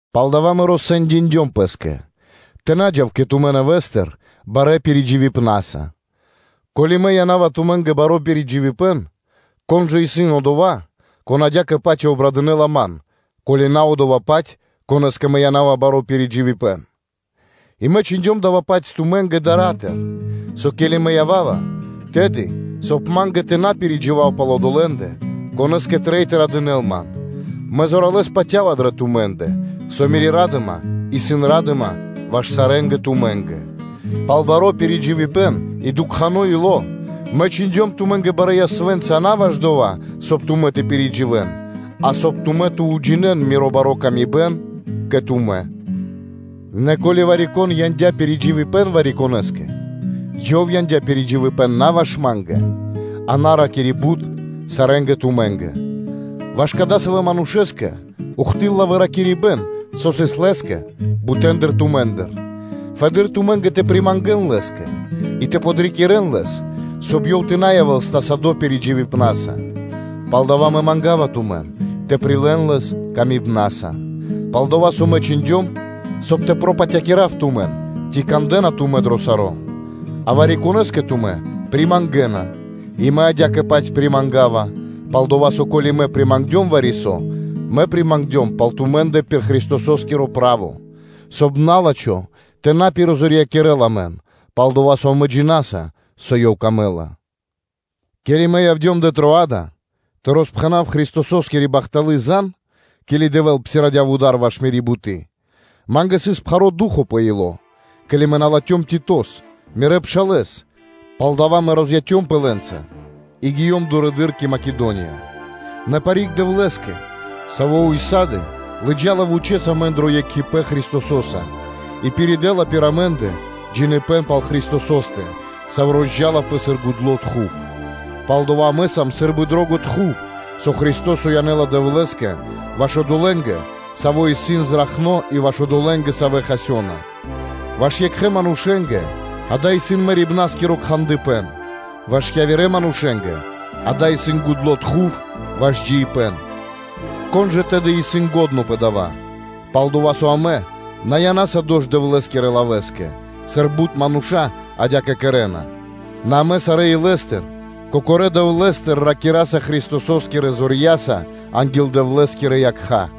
Палдава́ мэ россэндиндём пэ́скэ тэ на джав кэ тумэ́ нэвэ́стыр барэ́ пиридживипнаса. Ко́ли мэ яна́ва тумэ́нгэ баро́ пиридживипэн, кон жа исын одова́, кон адя́кэ-паць и обрадынэла ман, ко́ли на одова́-паць, конэ́скэ мэ яна́ва баро́ пиридживипэн? И мэ чхиндём дава́-паць тумэ́нгэ дара́тыр (дарьятыр), со ке́ли мэ ява́ва, тэды, соб (кай) ма́нгэ тэ на пиридживав пал одолэ́ндэ, конэ́скэ трэй тэ радынэл ман, мэ зоралэ́с патя́ва дрэ тумэ́ндэ, со мири́ ра́дыма исын ра́дыма ваш сарэ́ тумэ́нгэ. Пал баро́ пиридживипэн и дукхано ило́ мэ чхиндём тумэ́нгэ барэ́ ясвэ́нца на ваш дова́, соб (кай) тумэ́ тэ пиридживэн, а соб (кай) тумэ́ тэ уджинэ́н мири́ бари пшалы́тко паты́в кэ тумэ́. Нэ ко́ли вари-кон яндя́ пиридживипэн вари-конэ́скэ, ёв яндя́ пиридживипэн на ваш ма́нгэ, а на ракири́ бут, сарэ́нгэ тумэ́нгэ. Ваш кадасавэ́ манушэ́скэ ухты́лла (до́си) выракирибэн, со сыс лэ́скэ бутэндыр тумэ́ндыр; соб (кай) тумэ́ пэ проти фэды́р тэ примангэн лэ́скэ и тэ подрикирэн лэс, соб (кай) ёв тэ на явэ́л стасадо́ пиридживипна́са. Палдава́ мэ манга́ва тумэн тэ прилэ́н лэс ласкаса. Пал-дова́ со мэ чхиндём, соб (кай) тэ пропатякирав тумэн, ци кандэ́на тумэ́ дро саро́. А вари-конэ́скэ тумэ́ примангэна и мэ адя́кэ-паць примангава; пал-дова́ со, ко́ли мэ примангдём вари-со, мэ примангдём дава́ пал тумэ́ндэ пир Христосо́скиро право; соб (кай) на́лачхо тэ на пиризорьякирэл амэн, пал-дова́ со амэ джина́са, со ёв камэ́ла. Ке́ли мэ явдём дрэ Троада тэ роспхэнав Христососкири бахталы́ зан (звесь), ке́ли Дэвэ́л псирадя вуда́р ваш мири́ буты́, ма́нгэ сыс пхаро́ ду́хо (фа́но) пэ ило́, ке́ли мэ на латхём Титос, мирэ́ пшалэ́с, палдава́ мэ розяцёмпэ лэ́нца и гиём дурэды́р кэ Македония. Нэ парик Дэвлэ́скэ, Саво́ ўса́ды (сак) лыджа́ла вучэ́с амэн дро екхипэ́н Христосо́са и пиридэла пир амэ́ндэ джиныбэ́н пал Христосо́стэ, саво́ амэ сунгаса (сунгаваса) сыр гудло́ кхандыпэн. Пал-дова́ со амэ сам сы́рбы гудло́ тхув (дымо), со Христо́со янэ́ла Дэвлэ́скэ ваш одолэ́нгэ, савэ́ исын зракхнэ́ и ваш одолэ́нгэ, савэ́ хасёна; ваш екхэ манушэ́нгэ дава́ исын мэрибнаскиро кхандыпэн, ваш явирэ манушэ́нгэ дава́ исын джиибна́скири сунг. Кон жа, тэды, исын лачхо́ пэ дава́? Пал-дова́ со амэ на янаса дош Дэвлэ́скирэ лавэ́скэ, сыр бут мануша́ адя́кэ кэрэ́на, нэ амэ сарэ́ илэ́стыр, Кокорэ́ Дэвлэ́стыр ракираса Христосо́скирэ зорья́са анги́л Дэвлэ́скирэ якха́.